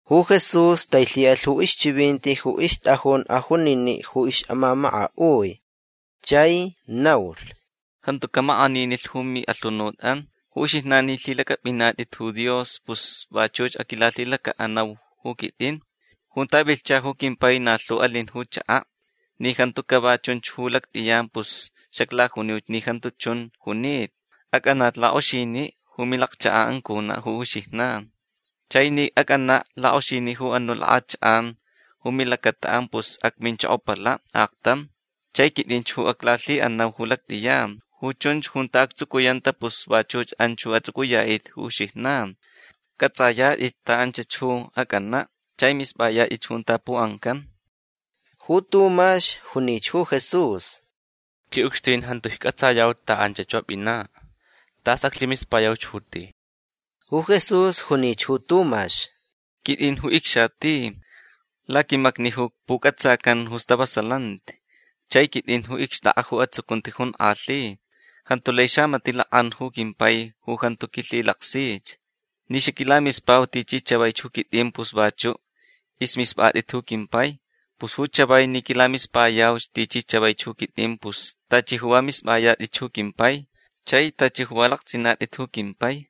Ju Jesús tailhi'alh ju ixchivinti ju ixt'ajun ajunini' ju ix'amamaka'ui chai naulh: ―Jantu ca'amak'aninilh ju mi'alhunut'an. Ju uxijnan ni lhilac'ap'inat'it ju Dios pus vachuch aquilalhilaca'anau ju quit'in. Junta vilhcha ju quimpai na lhu alin ju chaka'. Ni jantu cava chunch ju lact'iyan pus xaclajuniuch ni jantu chun junita. Ac'anach lak'oxini' ju milacchaka'an cuna' ju uxijnan. Chai ni ac'ana' lak'oxini' ju anu' lak'achak'an ju milacata'an pus acminchokopala' aktam. Chai quit'inch ju aclalhi'anau ju lact'iyan. Ju chunch junta actsucuyanta pus vachuch anch ju ats'uc'uya'it'it ju uxijnan. C'ats'ayat'itch ta anchach ju ac'ana' chai misp'ayat'itch junta pu'ancan. Ju Tumax junich ju Jesús: ―Qui'ucxtin jantu icc'atsayau ta anchach ju ap'ina'. Tas aclhimispayauch ju ti. Ju Jesús junich ju Tumax: ―Quit'in ju icxati. Laquimacni ju puc'atsacan ju stavasalanti. Chai quit'in ju icxt'ak'a ju atsucunti jonk'alhi. Jantu lai xamati' lak'an ju quimpai ju jantu quilhilaksich. Ni xaquilamispau tichi chavaich ju quit'in pus vachu' ismisp'at'it ju quimpai. Pus ju chavai ni quilamispayauch tichi chavaich ju quit'in pus tachi ju va misp'ayat'itch ju quimpai. Chai tachi ju va lakts'inat'it ju quimpai.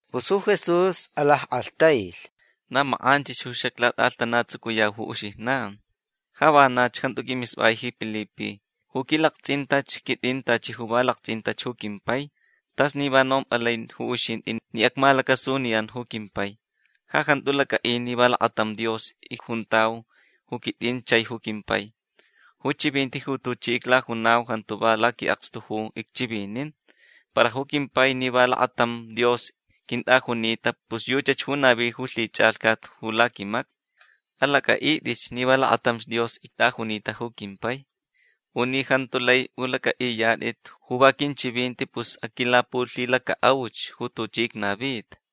Pus ju Jesús alack'alhtailh: ―Na mak'anchich ju xaclat'a'alhtanatsucuyau ju uxijnan. Ja vanach jantu q'uimisp'ai ji Pilipe. Ju quilakts'intach quit'in tachi ju va lakts'intach ju quimpai. T'as ni va nomp'alai ju uxint'i ni acmalacasuniyan ju quimpai. Ja jantu lac'a'i ni va lakatam Dios icjuntau ju quit'in chai ju quimpai. Ju chivinti ju tuchi iclajunau jantu va laqui'akstu ju icchivinin. Para ju quimpai ni va lakatam Dios quint'ajunita pus yuchach ju navi ju lhich'alhcat ju laquimacni. Alac'a'it'itch ni va lakatamch Dios ict'ajunita ju quimpai. U ni jantu lai p'ulac'a'iyat'it ju va quinchivinti pus aquilapulhilaca'auch ju tuchi icnavita.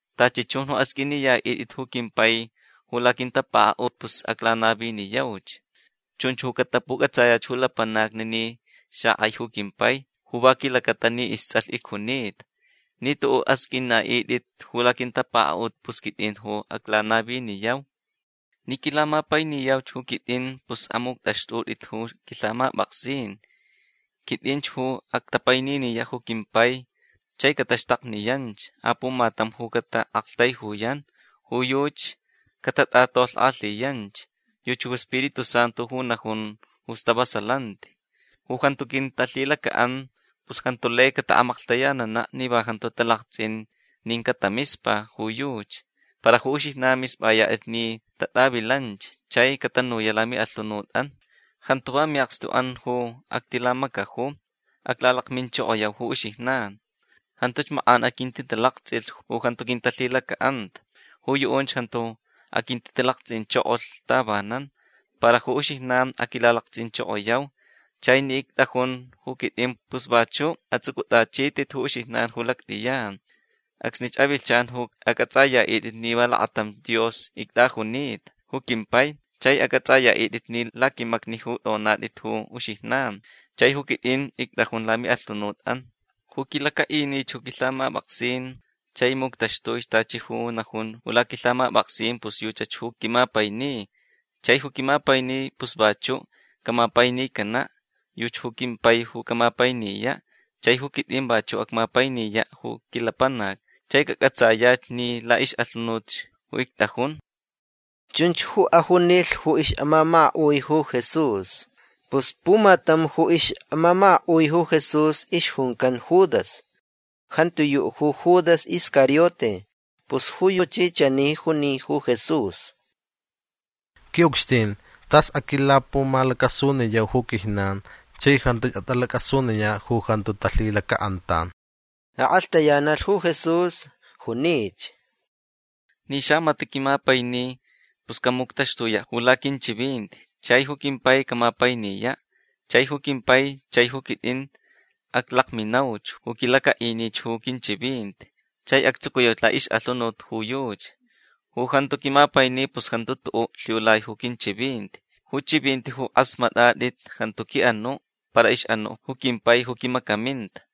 Tachi chun ju asq'uiniya'it'it ju quimpai ju laquintapaka'ut pus aclanaviniyauch. Chunch ju catapuc'atsayach ju lapanacni ni xak'ai ju quimpai ju va quilacata ni ists'alh icjunita. Ni tu'u' asq'uina'it'it ju laquintapaka'ut pus quit'in ju aclanaviniyau. Ni quilamapainiyau ju quit'in pus amuct'axt'ut'it ju quilhamap'aksin. Quit'inch ju actapaininiya' ju quimpai chai cataxtakniyanch apumatam ju cata'aktaijuyan. Ju yuchi catat'atolhk'alhiyanch. Yuchi ju Spiritu Santu ju najun ju stavasalanti. Ju jantu quintalhilaca'an pus jantu lai cata'amaklhtayanana' ni va jantu talakts'in nin catamispa ju yuchi. Para ju uxijnan misp'ayat'it ni tat'avilanch. Chai catanuya' lami'alhunut'an. Jantu va mi'akstu'an ju actilamacaju. Aclalakminchokoyau ju uxijnan. Jantuch mak'an aquintitalakts'ilh ju jantu quintalhilaca'anta. Ju yu'unch jantu aquintitalakts'inchokolh tavanan. Para ju uxijnan aquilalakts'inchokoyau. Chai ni ict'ajun ju quit'in pus vachu' ats'uc'ut'achit'it ju uxijnan ju lact'iyan. Acsnich avilhchan ju ac'ats'aya'it'it ni va lakatamch Dios ict'ajunita ju quimpai. Chai ac'ats'aya'it'it ni laquimacni ju t'onat'it ju uxijnan chai ju quit'in ict'ajun lami'alhunut'an. Ju quilaca'inich ju quilhamap'aksin chai muctaxtuich tachi ju najunch ju laquilhamap'aksin pus yuchach ju quimapaini. Chai ju quimapaini pus vachu' camapainicana'. Yuchi ju quimpai ju camapainiya'. Chai ju quit'in vachu' acmapainiya' ju quilapanac. Chai cac'atsayach ni la'ix'alhunutch ju ict'ajun. ―Chunch ju ajunilh ju ix'amamaka'ui ju Jesús. Pus pumatam ju ix'amamaka'ui ju Jesús ixjuncan Judas. Jantiyu' ju Judas Iscariote. Pus ju yuchi chani juni ju Jesús: ―Qui'ucxtin tas aquilapumalacasuniyau ju quijnan chai jantuch at'alac'asuniya' ju jantu talhilaca'antan. Ak'alhtayanalh ju Jesús. Junich: ―Ni xamati' quimapaini pus camuctaxtuya' ju laquinchivinti. Chai ju quimpai camapainiya'. Chai ju quimpai chai ju quit'in aclakminauch ju quilaca'inich ju quinchivinti. Chai actsucuyauch la'ix'alhunut ju yuchi. Ju jantu quimapaini pus jantu tu'u' lhiulai ju quinchivinti. Ju chivinti ju k'asmat'at'it jantu qui'anu' para ix'anu' ju quimpai ju quimacaminta.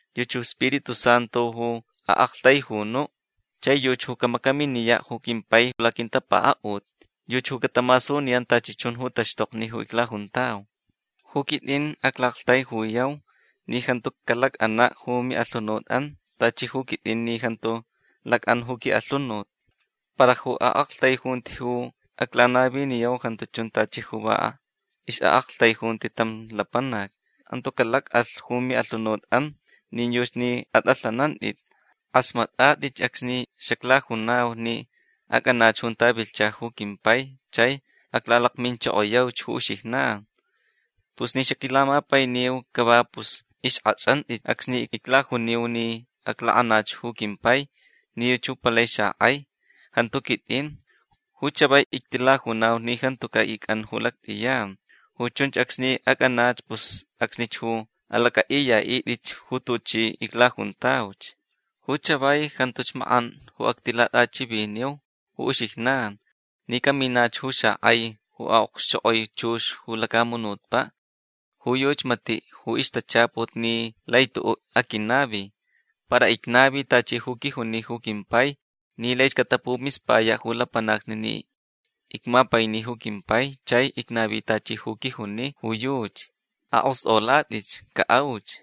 Yuchi ju Spiritu Santu ju a'aktaijunu'. Chai yuchi ju camacaminiya' ju quimpai laquintapaka'ut. Yuchi ju catamasuniyan tachi chun ju taxtokni ju iclajuntau. Ju quit'in acla'aktaijuyau ni jantu calac'ana' ju mi'alhunut'an. Tachi ju quit'in ni jantu lac'an ju qui'alhunut. Para ju a'aktaijunti ju aclanaviniyau jantu chun tachi ju va ix'a'aktaijunti tam lapanac. Jantu calac'alh ju mi'alhunut'an nin yuchi ni at'alhanant'it. K'asmat'at'itch acsni xaclajunau ni ac'anach junta vilhcha ju quimpai chai aclalakminchokoyauch ju uxijnan. Pus ni xaquilamapainiu cava pus ixk'ach'ant'itch acsni iclajuniu ni aclak'anach ju quimpai ni yuchi ju palai xak'ai. Jantu quit'in. Ju chavai ictilajunau ni jantuca' ic'an ju lact'iyan. Ju chunch acsni ac'anach pus acsnich ju alac'a'iya'it'itch ju tuchi iclajuntauch. Ju chavai jantuch mak'an ju actilat'achiviniu ju uxijnan ni caminach ju xak'ai ju okxchok'oi chux ju lacamunutpa'. Ju yuchi mati' ju ixtachaput ni lai tu'u' aquinavi. Para icnavi tachi ju quijuni ju quimpai ni laich catapumispaya' ju lapanacni ni icmapaini ju quimpai chai icnavi tachi ju quijuni ju yuchi. Ak'ost'olat'itch. Ca'auch.